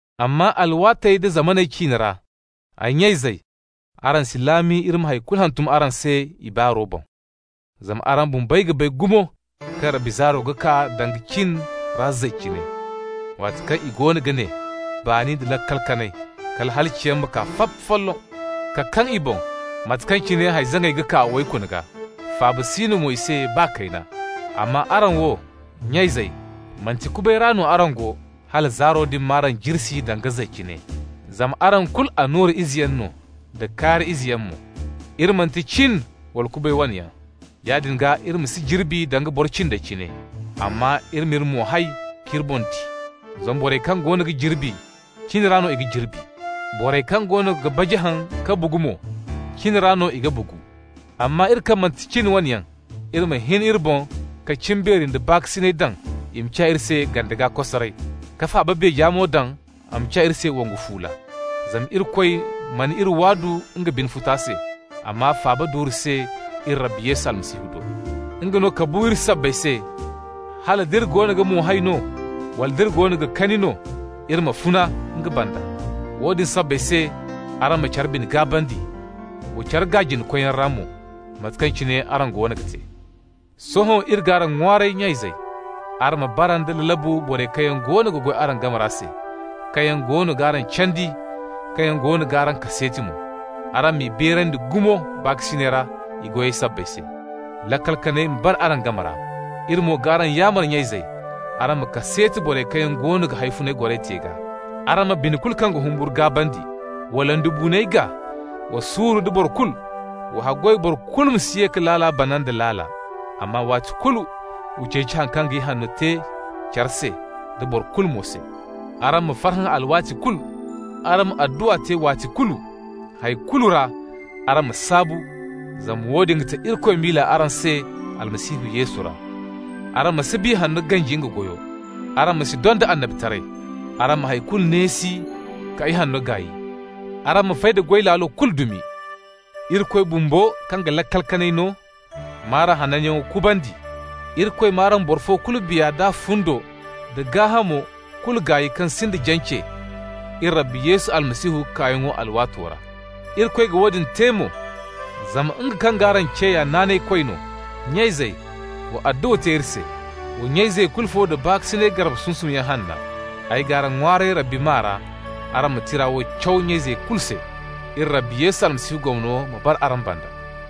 Amma alwaatey da zamaney ciine ra, ay nya-izey, araŋ si laami iri ma hay kulu hantum araŋ se i baaro boŋ. Zama araŋ bumbey ga bay gumo kaŋ Rabbi zaaro ga kaa danga cin ra zay cine. Waati kaŋ i goono ga ne: «Baani nda laakal kanay!» kala halaciyaŋ ma kaa, fap folloŋ! ka kaŋ i boŋ, mate kaŋ cine hay-zaŋay ga kaa waykuno gaa. Faaba si no i se mo baa kayna. Amma araŋ wo, nya-izey, manti kubay ra no araŋ go, hala zaaro din m'araŋ jirsi danga zay cine. Zama araŋ kulu annura izeyaŋ no da kaari izeyaŋ mo. Iri manti cin wala kubay wane yaŋ. Yaadin gaa iri ma si jirbi danga boro cindey cine, amma iri m'iri mo hay k'iri boŋ di. Zama borey kaŋ goono ga jirbi, cin ra no i ga jirbi. Borey kaŋ goono ga baji haŋ ka bugu mo, cin ra no i ga bugu. Amma iri kaŋ manti cin wane yaŋ, iri ma hin iri boŋ ka cimbeeri nda baakasinay daŋ i ma ciya iri se gande gaa kosaray, ka faaba beeja mo daŋ a ma ciya iri se wongu fuula. Zama Irikoy mana iri waadu nga bine futa se, amma faaba duure se iri Rabbi Yesu Almasihu do. Nga no ka bu iri sabbay se hal d'iri goono ga mo hay no wala nd'iri goono ga kani no, iri ma funa nga banda. Woodin sabbay se araŋ ma care bine gaabandi, wa care gaa jina-koyyaŋ ra mo, mate kaŋ cine araŋ goono ga te. Sohõ iri g'araŋ ŋwaaray, nya-izey, araŋ ma bara nda lalabu borey kaŋ yaŋ goono ga goy araŋ game ra se, kaŋ yaŋ goono g'araŋ candi, kaŋ yaŋ goono g'araŋ kaseeti mo. Araŋ m'i beerandi gumo baakasinay ra i goyey sabbay se. Laakal kanay ma bara araŋ game ra. Iri mo g'araŋ yaamar, nya-izey, araŋ ma kaseeti borey kaŋ yaŋ goono ga hawfunay goray te gaa. Araŋ ma bine kulu kaŋ ga humburu gaabandi. Wa londibuuney gaa. Wa suuru nda boro kulu. Wa haggoy boro kulu ma si ye ka laala bana nda laala. Amma waati kulu wa ceeci haŋ kaŋ ga ti ihanno care se da boro kulu mo se. Araŋ ma farhã alwaati kulu. Araŋ ma adduwa te waati kulu. Hay kulu ra araŋ ma saabu, zama woodin ga ti Irikoy miila araŋ se Almasihu Yesu ra. Araŋ ma si Biya Hanno ganji nga goyo. Araŋ ma si donda annabitaray. Araŋ ma hay kulu neesi ka ihanno gaay. Araŋ ma fay da goy laalo kulu dumi. Irikoy bumbo, kaŋ ga laakal kanay no, m'araŋ hananyaŋo kubandi. Irikoy m'araŋ boro fo kulu, biya da fundo da gaahamo kulu, gaay kaŋ sinda jance, iri Rabbi Yesu Almasihu kaayaŋo alwaato ra. Irikoy ga woodin te mo, zama nga kaŋ g'araŋ ce ya naanaykoy no. Nya-izey, wa adduwa te iri se. Wa nya-izey kulu fo da baakasinay garbe sunsumyaŋ hanna. Ay g'araŋ ŋwaaray Rabbi maa ra, araŋ ma tira wo caw nya-izey kulu se. Iri Rabbi Yesu Almasihu gomno ma bara araŋ banda.